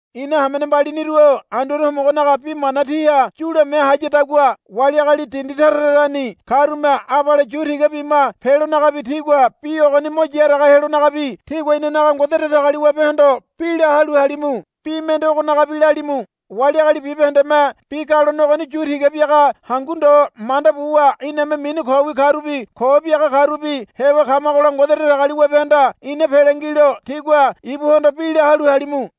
Ina hamene mbaliniru-o Anduane Homogonaga bi mana tíha yulame hayadagua wali agali dindi tara tarani karume abale yu tiga bima pelonagabi tigua bi ogoni mo yaraga helonagabi tígua inanaga Ngode Datagaliwabehondo bi la halu halimu. Bi mende ogonagabi lalimu. Wali agali bibahendeme bi galone ogoni yu tiga biaga hangu ndo manda buwa iname mini kowi karubi ko biaga karubi heba kamagola Ngode Datagaliwabehanda ina pele ngilo tígua ibuhondo bi la halu halimu.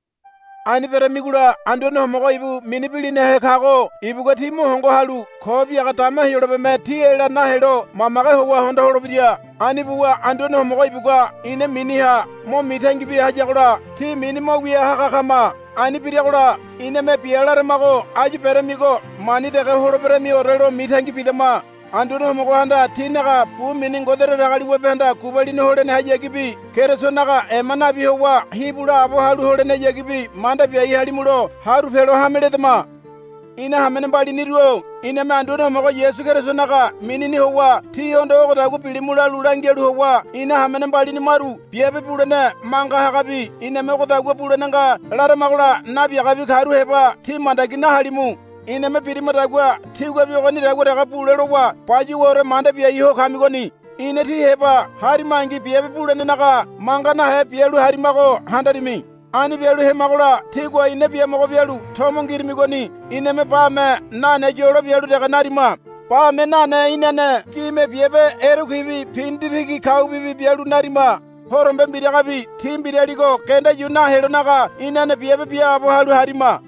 Ani beramigola Anduane Homogo ibu mini bilinahe kago ibugua tí mo hongo halu ko biaga dama Heyolabeme tí ela nahelo mamage howa hondo holebira. Ani buwa Anduane Homogo ibugua ina miniha mo mitangi bia hayagola tí mini mo wia haga kama. Ani biragola iname bia laramago áyu beramigo mani dege holeberemiore lo mitangi bidama. Anduane Homogohanda tínaga bu mini Ngode Datagaliwabehanda gubalini holenehayagibi Kerisonaga ema nabi howa hibu laabo halu holenehayagibi manda biai halimulo haru pelo hame ledama. Ina hamene mbaliniru-o iname Anduane Homogo Yasu Kerisonaga minini howa tíhondo ogodagua bilimu lalu langialu howa ina hamene mbalini maru biabe bulene manga hagabi iname ogodagua bulene nga laramagola nabiagabi karu heba tí mandagi nahalimu. Iname birimadagua tíguabi ogonidagua dege bule lowa bayuwaore manda biai ho kamigoni. Ina tí heba harimangi biabe bulenenaga manga nahe bialu harimago handarimi. Ani bialu hemagola tígua ina biamogo bialu tomo ngirimigoni iname bame nane yolo bialu dege narima. Bame nane inane gime biabe erekuibi pinditigi kaubibi bialu narima. Horombe mbiragabi tí mbiraligo genda yu nahelonaga inane biabe biaabo halu harima.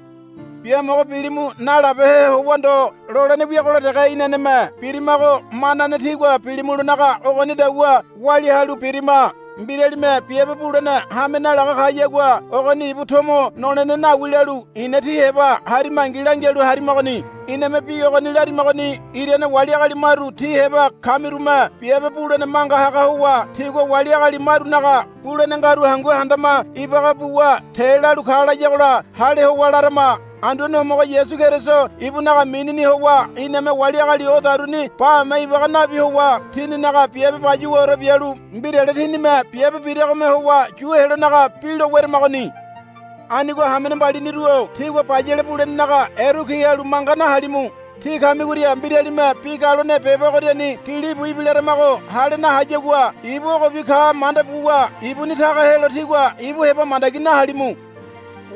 Biamogo bilimu nalabehe howa ndo lolene wiagola dege inaneme birimago manane tígua bilimulonaga ogonidagua walia halu birima. Mbiralime biabe bulene hame nalaga kayagua ogoni ibu tomo nolene nawi lalu ina tí heba harimangi langialu harimagoni. Iname bi ogoni larimagoni irane wali agali maru tí heba kamirume biabe bulene manga haga howa tigua wali agali marunaga bulene ngaru hangu handama ibaga buwa te lalu ka layagola hale howa larama. Anduane Homogo Yasu Keriso ibunaga minini howa iname wali agali odaruni bame ibaga nabi howa tininaga biabe bayuwaore bialu mbirale tinime biabe biragome howa yu helonaga bi lo weramagoni. Anigo hamene mbaliniru-o tígua bayale bulenenaga erekui halu manga nahalimu. Tí kamigoria mbiralime bi galone beba ogoriani gilibu ibilaramago hale nahayagua ibu ogobi ka manda buwa ibuni taga helo tígua ibu heba mandagi nahalimu.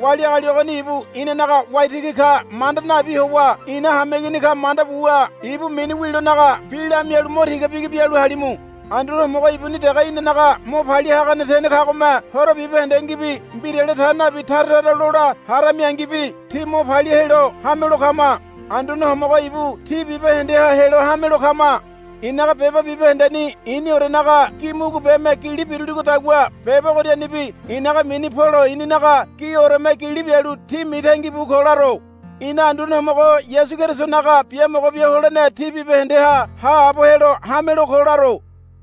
Wali agali ogoni ibu inanaga waitigi ka manda nabi howa ina hameigini ka manda buwa ibu mini wilonaga bi lamialu mo tiga bigi bialu halimu. Anduane Homogo ibuni dege inanaga mo palia hagane tene kagome horo bibahendengibi mbirale ta nabi tara tara lola haramingibi tí mo palia helo hamelo kama. Anduane Homogo ibu tí bibahendeha helo hamelo kama. I̱naga beba bibahendeni i̱niorenaga gi mugubeme gili biruligodagua beba ogorianibi i̱naga mini Polo i̱ninaga gioreme gili bialu tí mitangibu ko laro. Ina Anduane Homogo Yasu Kerisonaga biamogo bia holene tí bibahendeha haabo helo hamelo ko laro.